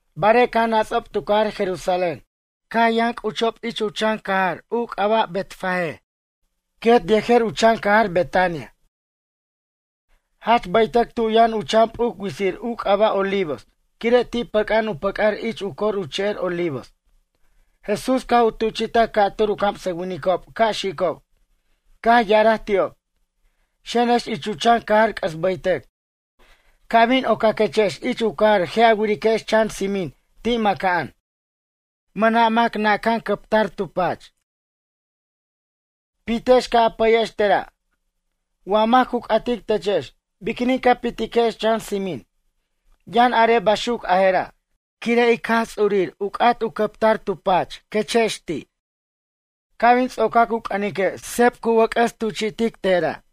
Barej caj nats'ob tu cajar Jerusalén, caj yʌn c'uchob u chan cajar u c'aba' Betfagé quet yejer u chan cajar Betania. Jach baytʌc tu yʌn u chan p'uc witsir u c'aba' Olivos quire' ti' pʌca'an u pʌc'ar ich u cor u che'er Olivos. Jesús caj u tuchi'taj ca'tur u camsʌwinicob ca' xicob. Caj ya'araj ti'ob: ―Xenex ich u chan cajar c'ʌs baytʌc. Ca' bin ocaquechex ich u cajar je' a wiriquex chan tsimin ti' maca'an, mʌna' mac naca'an cʌptar u cʌpmʌn tu pach. Pitex ca' a pʌyex tera'. Wa mac cu c'atic techex: “Biquinin ca pitiquex chan tsimin?” Yʌn are baxuc a jera': Quire' ic Jaj Ts'urir u c'at u cʌptar tu pach, quechex ti'. Ca' bin tsocac u c'ʌnique' seb cu wʌc'ʌs tuchi'tej tera'.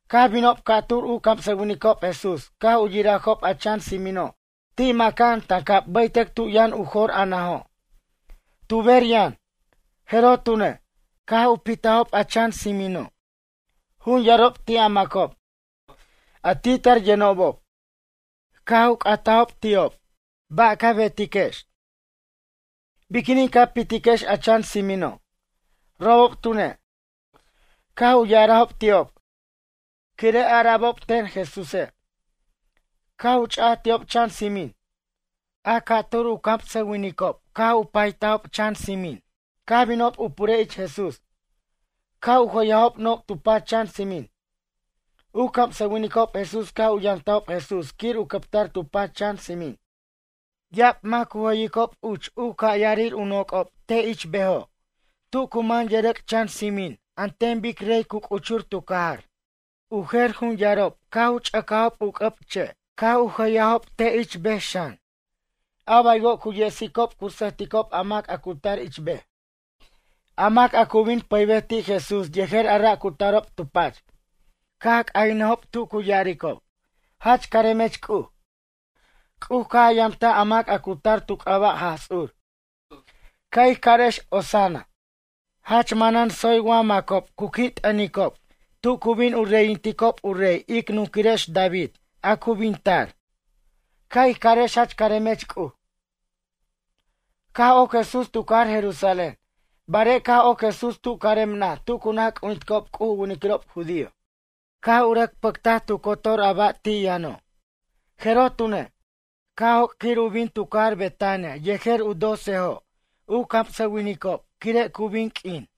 Caj binob ca'tur u camsʌwinicob Jesús caj u yirajob a chan tsinino' ti' maca'an tancab baytʌc tu yʌn u jor a najo'. Tu ber yʌn. Jeroj tune', caj u pitajob a chan tsimino'. Jun yarob ti' a macob, a ti' tar yʌnobob, caj u c'atajob ti'ob: ―Ba' ca betex? Biquinin ca pitiquex a chan tsimino'? Robob tune', caj u ya'arajob ti'ob quire' ara'bob ten Jesúse', caj cha'aj ti'ob chan tsimin. A ca'tur u camsʌwinicob caj u paytajob chan tsimin, caj binob u purej ich Jesús, caj u jʌyajob noc' tu pach chan tsimin. U camsʌwinicob Jesús caj u yamtajob Jesús quir u cʌptar tu pach chan tsimin. Ya'ab mac cu jʌyicob uch u ca' yarir u noc'ob te' ich bejo' tu cu man yʌrʌc' chan tsimin an ten bic rey cu c'uchur tu cajar. U jer jun yarob caj u ch'ʌcajob u c'ʌb che' caj u jʌyajob te' ich bej xan, a baywo' cu yesicob cu sʌjticob a mac a cu tar ich bej. A mac a cu bin pʌybej ti' Jesús yejer a ra' cu tarob tu pach, caj c'ayʌnʌjob tu cu ya'aricob: ―Jach caremech C'uj. C'uj caj a yamtaj a mac a cu tar tu c'aba' Jaj Ts'ur. Ca' ij carex Hosanna. Jach manan tsoy wa macob cu qui' t'ʌnticob tu cu bin u reyinticob u rey ic nunquirex David a cu bin tar. Ca' ij carex Jach caremech C'uj. Caj oc Jesús tu cajar Jerusalén. Barej caj oc Jesús tu carem naj tu cu naj c'ujinticob C'uj u winiquirob judío, caj u rʌc pʌctaj tu cotor a ba' ti' yʌno'. Jeroj tune', caj joc' quir u bin tu cajar Betania yejer u docejo' u camsʌwinicob quire' cu bin q'uin.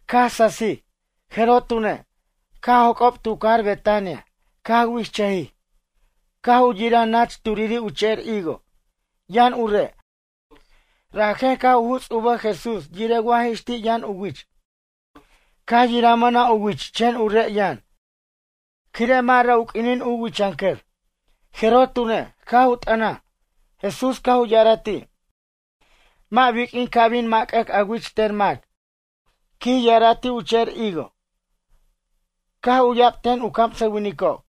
Caj sasij, jeroj tune', caj joc'ob tu cajar Betania, caj wi'ijchʌjij. Caj u yiraj nach turiri' u che'er higo, yʌn u re', rajen caj u juts' u bʌj Jesús yirej wa jix ti' yʌn u wich, caj yiraj mʌna' u wich chen u re' yʌn, quire' mʌ' ra' u q'uinin u wichʌnʌcʌr. Jeroj tune', caj u t'ʌnaj, Jesús caj u ya'araj ti': ―Mʌ' biq'uin ca' bin mac'ʌc a wich ten mac ―quij ya'ara' ti' u che'er higo. Caj u'ya'b ten u camsʌwinicob.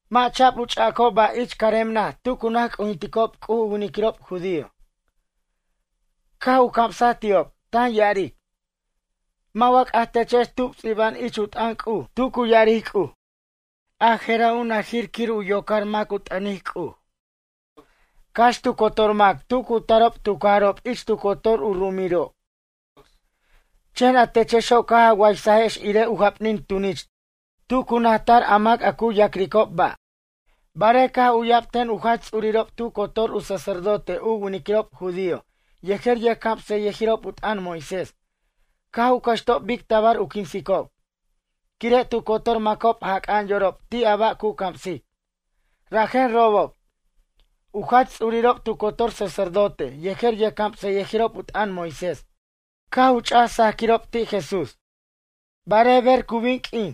Mʌ' cha'b u ch'a'acob ba' ich carem naj tu cu naj c'ujinticob C'uj u winiquirob judío. Caj u camsaj ti'ob, tan ya'aric: ―Mʌ' wa c'aj techex tub ts'iba'an ich u t'ʌn C'uj tu cu ya'aric C'uj: “A jera' u najir quir u yocar mac u t'ʌnic C'uj, cax tu cotor mac tu cu tarob tu cajarob ich tu cotor u ru'umirob”; chen a techexo' caj a waysajex irej u japnin tunich tu cu naj tar a mac a cu ya'cricob ba'. Barej caj u'ya'b ten u jach ts'urirob tu cotor u sacerdote u winiquirob judío yejer yʌjcamsʌyʌjirob u t'ʌn Moisés caj u cʌxtob bic tabar u quinsicob. Quire' tu cotor macob jac'a'an yorob ti' a ba' cu camsic, rajen robob, u jach ts'urirob tu cotor sacerdote yejer yʌjcamsʌyʌjirob u t'ʌn Moisés caj u ch'aj saquirob ti' Jesús. Barej ber cu bin q'uin,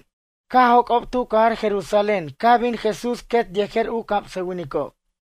caj joc'ob tu cajar Jerusalén caj bin Jesús quet yejer u camsʌwinicob.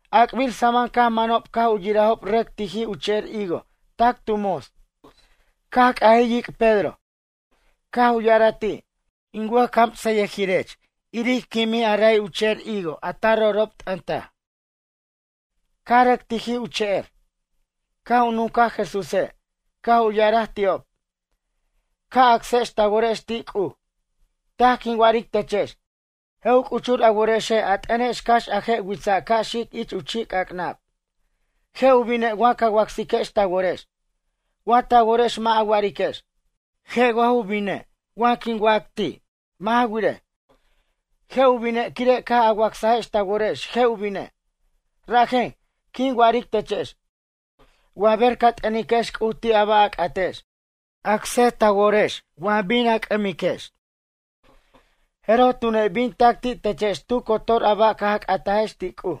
A'acbir samam caj manob caj u yirajob rʌc tijij u che'er higo tac tu mots. Caj c'ajij yic' Pedro, caj u ya'araj ti': ―In wʌjcamsʌyʌjirech, iric quimij a ray u che'er higo a ta ro'ro' t'ʌntaj, caj rʌc tijij u che'er. Caj u nuncaj Jesúse', caj u ya'araj ti'ob: ―Ca' acsex ta worex ti' C'uj. Taj quin wa'aric techex, je' u c'uchur a worexe' a t'ʌnex cax a je' witsa' ca' xic ich u chi'c'ac'nab, je' u bine' wa ca wacsiquex ta worex, wa ta worex mʌ' a wa'ariquex: “Je' wa ju bine' wa quin wac ti'.” Mʌ' ja wirej, je' u bine' quire' caj a wacsajex ta worex je' u bine'. Rajen, quin wa'aric techex, wa ber ca t'ʌniquex C'uj ti' a ba' a c'atex, acsej ta worex wa bin a c'ʌmiquex jeroj tune' bin tac ti' techex tu cotor a ba' caj a c'atajex ti' C'uj.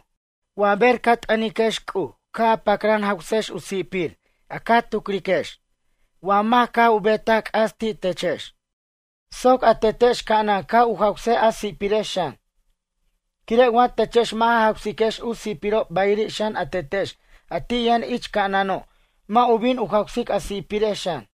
Wa ber ca t'ʌniquex C'uj ca' a pacran jawsex u si'pir a ca tucriquex wa mac caj u betaj c'as ti' techex soc a Tetex ca'anan ca' u jawsej a si'pirex xan. Quire' wa techex mʌ' ja jawsiquex u si'pirob bayiri' xan a Tetex a ti' yʌn ich ca'anano' mʌ' u bin u jawsic a si'pirex xan.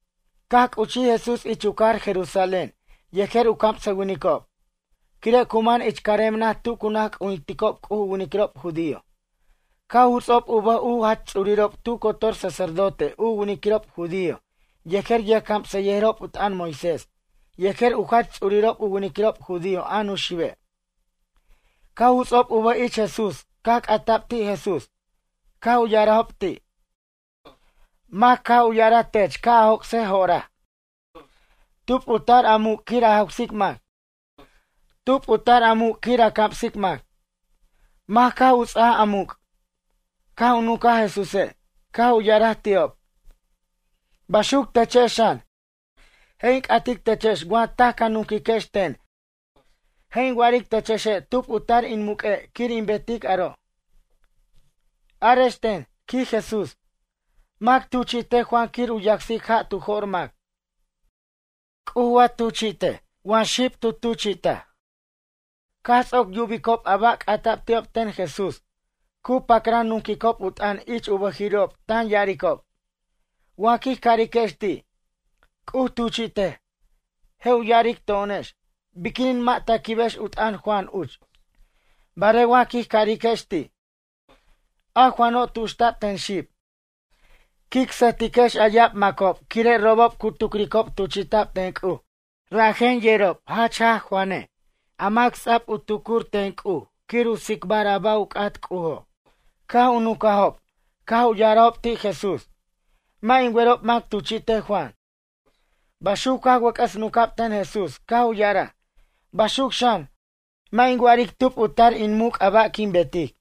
Caj c'uchij Jesús ich u cajar Jerusalén yejer u camsʌwinicob. Quire' cu man ich carem naj tu cu naj c'ujinticob C'uj u winiquirob judío, caj u juts'ob u bʌj u jach ts'urirob tu cotor sacerdote u winiquirob judío yejer yʌjcamsʌyʌjirob u t'ʌn Moisés yejer u jach ts'urirob u winiquirob judío a Nuxibe'. Caj u juts'ob u bʌj ich Jesús caj c'atab ti' Jesús. Caj u ya'arajob ti': ―Mac caj u ya'araj tech ca' a joc'sej jo'oraj? Tub u tar a muc' quir a jawsic mac? Tub u tar a muc' quir a camsic mac? Mac caj u ts'aj a muc'? Caj nuncaj Jesúse', caj u ya'araj ti'ob: ―Baxuc techex xan, je' in c'atic techex wa taj ca nunquiquex ten je' in wa'aric techexe' tub u tar in muq'ue' quir in betic aro'. Arex ten ―quij Jesús―. Mac tuchi'tej Juan quir u yacsic ja' tu jo'r mac. C'uj wa tuchi'tej wa xib tu tuchi'taj? Caj ts'oc yubicob a ba' c'ata'b ti'ob ten Jesús, cu pacran nunquicob u t'ʌn ich u bʌjiri'ob tan ya'aricob: ―Wa quij cariquex ti': “C'uj tuchi'tej”, je' u ya'aric to'onex: “Biquinin mʌ' ta quibex u t'ʌn Juan uch?” Barej wa quij cariquex ti': “A Juano' tuxta'b ten xib”, quic sʌjtiquex a ya'ab macob quire' robob cu tucricob tuchi'ta'b ten C'uj rajen yerob jach jaj Juane' a mac ts'a'b u tucuric ten C'uj quir u tsicbar a ba' u c'at C'ujo'. Caj u nucajob, caj u ya'arajob ti' Jesús: ―Mʌ' in werob mac tuchi'tej Juan. Baxuc caj wʌc'ʌs nunca'b ten Jesús caj u ya'araj: ―Baxuc xan, mʌ' in wa'aric tub u tar in muc' a ba' quin betic.